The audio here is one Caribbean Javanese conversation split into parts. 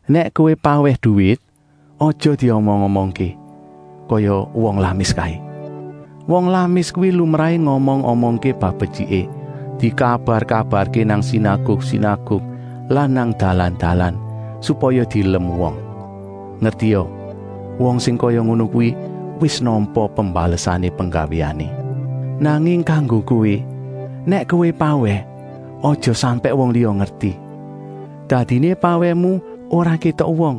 “Nèk kowé pawèh duwit, aja diomong-omongké, kaya wong lamis kaé. Wong lamis kuwi lumrahé ngomong-omongké bab betyiké, dikabar-kabarké nang sinaguk-sinaguk lan nang dalan-dalan, supaya dielem wong. Ngertia, wong sing kaya ngono kuwi wis nampa pembalesané penggawéané. Nanging kanggo kowé, nèk kowé pawèh, aja sampèk wong liya ngerti. Dadiné pawèhmu ora kétok wong,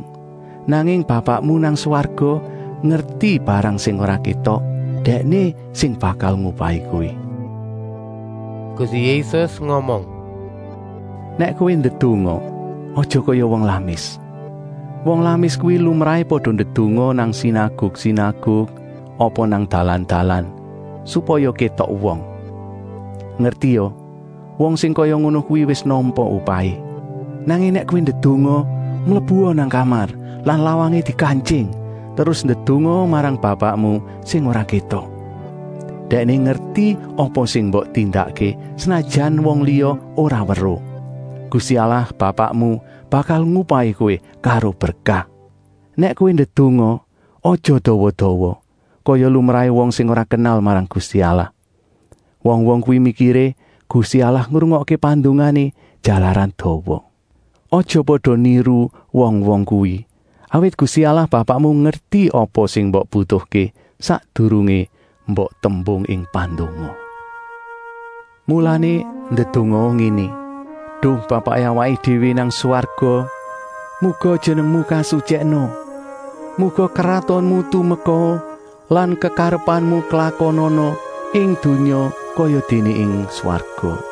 nanging Bapakmu nang swarga ngerti barang sing ora kétok, Dèkné sing bakal ngupahi kowé.” Gusti Yésus ngomong: “Nèk kowé ndedonga, aja kaya wong lamis. Wong lamis kuwi lumrahé pada ndedonga nang sinaguk-sinaguk apa nang dalan-dalan, supaya kétok wong. Ngertia, wong sing kaya ngono kuwi wis nampa upahé. Nanging nèk kowé ndedonga, mlebua nang kamar lan lawangé dikantying, terus ndedongaa marang Bapakmu sing ora kétok. Dèkné ngerti apa sing mbok tindakké, senajan wong liya ora weruh. Gusti Allah Bapakmu bakal ngupahi kowé karo berkah. “Nèk kowé ndedonga, aja dawa-dawa, kaya lumrahé wong sing ora kenal marang Gusti Allah. Wong-wong kuwi mikiré Gusti Allah ngrungokké pandongané, jalaran dawa. Aja pada niru wong-wong kuwi, awit Gusti Allah Bapakmu ngerti apa sing mbok butuhké, sakdurungé mbok tembung ing pandonga. Mulané ndedongaa ngéné: ‘Duh Bapaké awaké déwé nang swarga muga Jenengmu kasutyèkna. Muga kratonmu tumekaa lan kekarepanmu klakonana ing donya kayadéné nang swarga.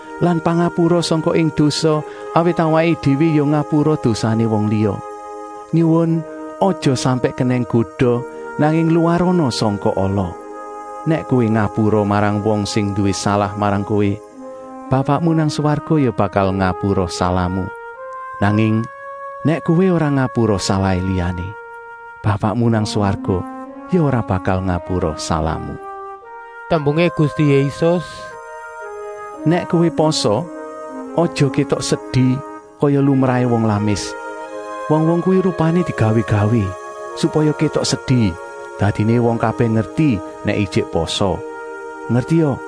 lan pangapura sangka ing dosa awit awaké déwé ya ngapura dosané wong liya. Nyuwun aja sampèk kenèng goda nanging luwarana sangka ala.’ “Nèk kowé ngapura marang wong sing nduwé salah marang kowé, Bapakmu nang swarga ya bakal ngapura salahmu. Nanging nèk kowé ora ngapura salahé liyané, Bapakmu nang swarga ya ora bakal ngapura salahmu.” Tembungé Gusti Yésus: “Nèk kowé pasa, aja kétok sedi kaya lumrahé wong lamis. Wong-wong kuwi rupané digawé-gawé, supaya kétok sedi, dadiné wong kabèh ngerti nèk ijik pasa. Ngertia,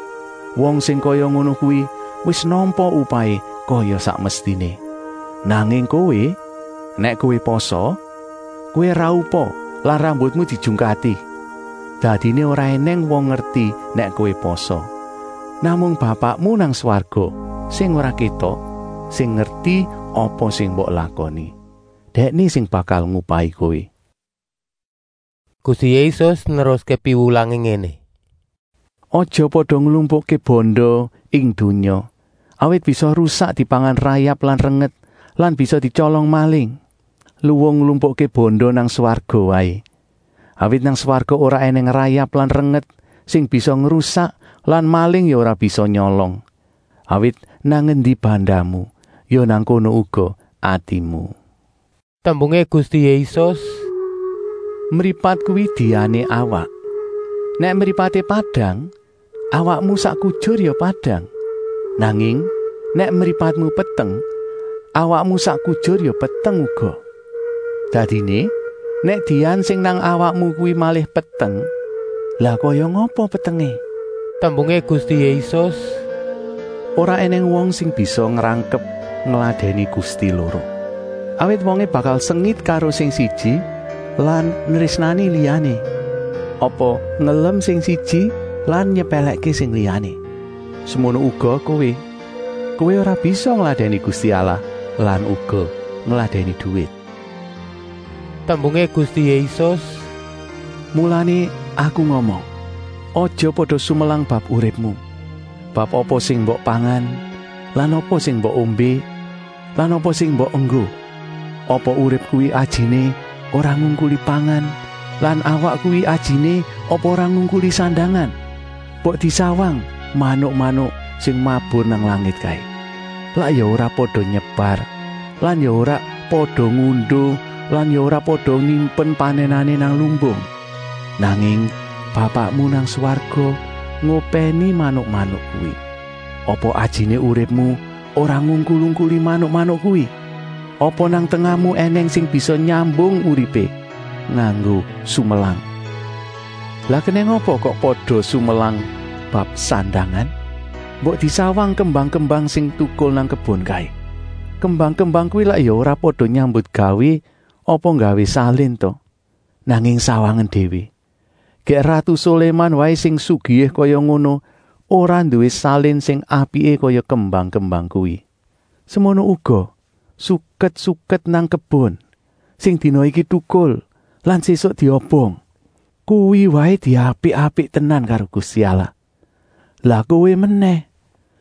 wong sing kaya ngono kuwi wis nampa upahé kaya sak mestiné. Nanging kowé, nèk kowé pasa, kowé raupa lan rambutmu dijungkati. Dadiné ora ènèng wong ngerti nèk kowé pasa. Namung Bapakmu nang swarga sing ora kétok sing ngerti apa sing mbok lakoni. Dèkné sing bakal ngupahi kowé.” Gusti Yésus neruské piwulangé ngéné: “Aja pada nglumpukké banda ing donya, awit bisa rusak dipangan rayap lan renget lan bisa dityolong maling. Luwung nglumpukké banda nang swarga waé, awit nang swarga ora ènèng rayap lan renget sing bisa ngrusak lan maling ya ora bisa nyolong. Awit nang endi bandamu, ya nang kono uga atimu.” Tembungé Gusti Yésus: “Mripat kuwi diané awak. Nèk mripaté padang, awakmu sak kujur ya padang. Nanging nèk mripatmu peteng, awakmu sak kujur ya peteng uga. Dadiné, nèk dian sing nang awakmu kuwi malih peteng, lah kaya ngapa petengé!” Tembungé Gusti Yésus: “Ora ènèng wong sing bisa ngrangkep ngladèni gusti loro. Awit wongé bakal sengit karo sing siji lan nrésnani liyané, apa ngelem sing siji lan nyepèlèkké sing liyané. Semono uga kowé, kowé ora bisa ngladèni Gusti Allah lan uga ngladèni duwit.” Tembungé Gusti Yésus: “Mulané Aku ngomong: aja pada sumelang bab uripmu, bab apa sing mbok pangan lan apa sing mbok ombé lan apa sing mbok enggo. Apa urip kuwi ajiné ora ngungkuli pangan lan awak kuwi ajiné apa ora ngungkuli sandangan? Mbok disawang manuk-manuk sing mabur nang langit kaé. Lak ya ora pada nyebar lan ya ora pada ngunduh lan ya ora pada nyimpen panènané nang lumbung. Nanging Bapakmu nang swarga ngopèni manuk-manuk kuwi. Apa ajiné uripmu ora ngungkul-ungkuli manuk-manuk kuwi? Apa nang tengahmu ènèng sing bisa nyambung uripé nganggo sumelang? “Lah kenèng apa kok pada sumelang bab sandangan? Mbok disawang kembang-kembang sing tukul nang kebon kaé. Kembang-kembang kuwi lak ya ora pada nyambutgawé apa nggawé salin ta? Nanging sawangen déwé, gèk ratu Soléman waé sing sugihé kaya ngono ora nduwé salin sing apiké kaya kembang-kembang kuwi. Semono uga suket-suket nang kebon, sing dina iki tukul lan sésuk diobong. Kuwi waé diapik-apik tenan karo Gusti Allah. Lah kowé menèh!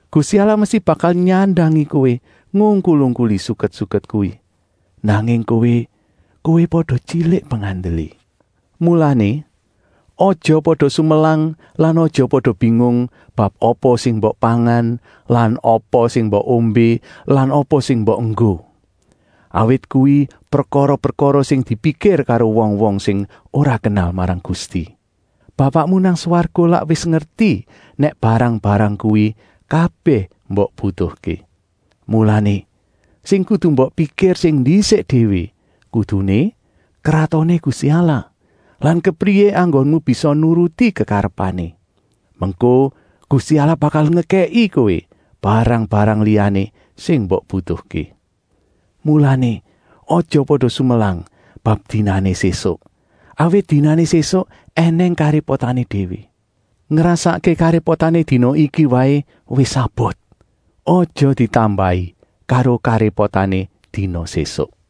Gusti Allah mesti bakal nyandangi kowé ngungkul-ungkuli suket-suket kuwi. Nanging kowé pada tyilik pengandelé. “Mulané, aja pada sumelang lan aja pada bingung bab apa sing mbok pangan lan mbok ombé lan mbok enggo. Awit kuwi prekara-prekara sing dipikir karo wong-wong sing ora kenal marang Gusti. Bapakmu nang swarga lak wis ngerti nèk barang-barang kuwi kabèh mbok butuhké. Mulané, sing kudu mbok pikir sing ndisik déwé kuduné Kratoné Gusti Allah lan kepriyé enggonmu bisa nuruti kekarepané. Mengko Gusti Allah bakal ngekèki kowé barang-barang liyané sing mbok butuhké. Mulané, aja pada sumelang bab dina sésuk, awit dinané sésuk ènèng karépotané déwé. Ngrasakké karépotané dina iki waé wis abot, aja ditambahi karo karépotané dina sésuk.”